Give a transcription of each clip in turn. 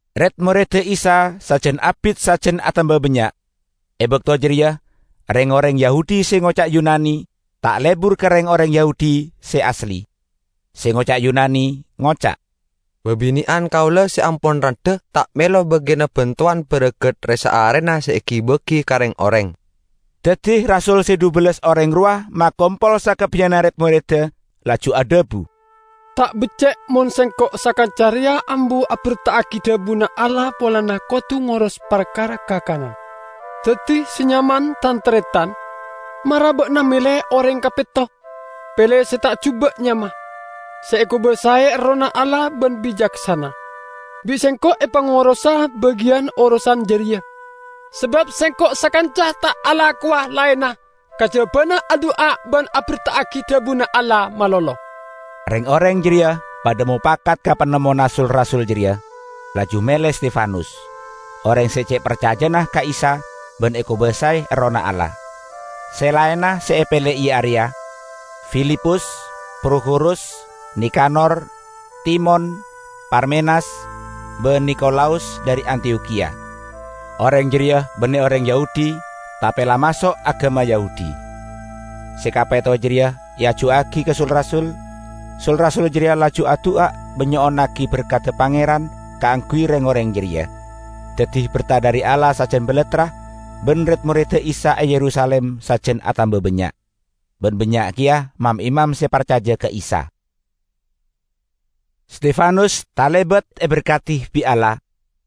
Red-moredda Isa sajan abit sajan atamba bannya'. E bakto jareya reng-oreng Yahudi se ngoca' Yunani ta' lebur ka reng-oreng Yahudi se asli. Se ngoca' Yunani ngoca', "Babine'an kaula se ampon randha ta' melo bagiyanna bantowan baragat re-saarena se egi-bagi ka reng-oreng." Daddi rasul se dhubellas oreng rowa makompol sakabbiyanna red-moredda, laju adhabu, "Ta' becce' mon sengko' sakanca reya ambu aberta'agi dhabuna Allah polana kodu ngoros parkara kakanan. Daddi, se nyaman, tan-taretan, mara ba'na mele oreng kapetto, pele se ta' juba' nyama, se ekobasae Errohna Allah ban bicaksana; bi' sengko' epangorosa bagiyan orosan jareya; sabab sengko' sakanca ta' alakowa laenna kajabana adu'a ban aberta'agi dhabuna Allah malolo." Reng-oreng jareya padha mopakat ka panemmona sul-rasul jareya, laju mele Stefanus, oreng se ce' parcajana ka Isa ban ekobasae Errohna Allah. Se laenna se epele iya areya: Filipus, Prokhorus, Nikanor, Timon, Parmenas, ban Nikolaus dhari Antiyokhiya; oreng jareya banne oreng Yahudi tape la maso' agama Yahudi. Se kapetto jareya eajuwagi ka sul-rasul; sul-rasul jareya laju adu'a ban nyo'onnagi berkadda Pangeran kaangguy reng-oreng jareya. Daddi berta dhari Allah sajan balattra ban red-moredda Isa e Yerusalim sajan atamba bannya'. Ban bannya' keya mam-imam se parcaja ka Isa. Stefanus talebat eberkadi bi' Allah,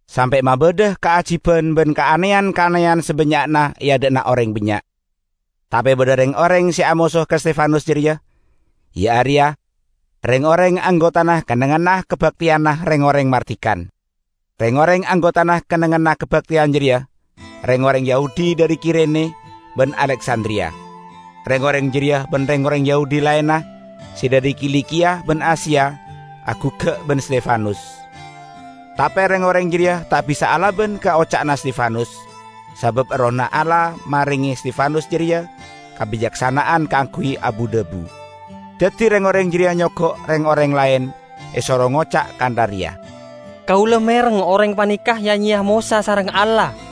sampe' mabadha kaajiban ban kaaneyan-kaaneyan sabannya'na e adha'na oreng bannya'. Tape badha reng-oreng se amoso ka Stefanus jareya, iya areya reng-oreng anggotana Kennengnganna Kabakteyanna Reng-oreng Mardikan. Reng-oreng anggotana kennengnganna kabakteyan jareya reng-oreng Yahudi dhari Kirene ban Aleksandriya. Reng-oreng jareya ban reng-oreng Yahudi laenna se dhari Kilikiya ban Asia aguggak ban Stefanus. Tape reng-oreng jareya ta' bisa alaban ka oca'na Stefanus, sabab Errohna Allah marenge Stefanus jareya kabicaksana'an kaangguy abu-dhabu. Daddi reng-oreng jareya nyogo' reng-oreng laen, esoro ngoca' kantha reya, "Kaula mereng oreng paneka ya-nyeya Mosa sareng Allah!"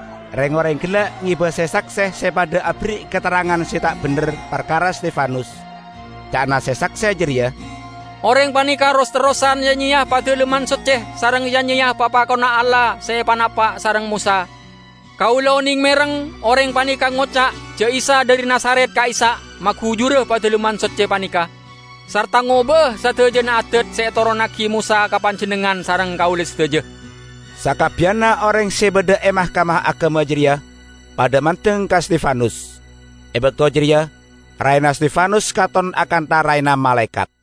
Reng-oreng gella' ngeba se-sakse se padha aberri' katerrangan se ta' bendher parkara Stefanus. Ca'na se-sakse jareya, "Oreng paneka ros-terrosan ya-nyeya Padalemman Socce sareng ya-nyeya papakonna Allah se epanapa' sareng Mosa. Kaula oneng mereng oreng paneka ngoca' ja' Isa dhari Nazaret ka'issa' magujura Padalemman Socce paneka, sarta ngoba'a sadajana adat se etoronnagi Mosa ka panjennengngan sareng kaula sadaja!" Sakabbiyanna oreng se badha e Mahkamah Agama jareya padha mandeng ka Stefanus. E bakto jareya raena Stefanus katon akantha raena malaekat.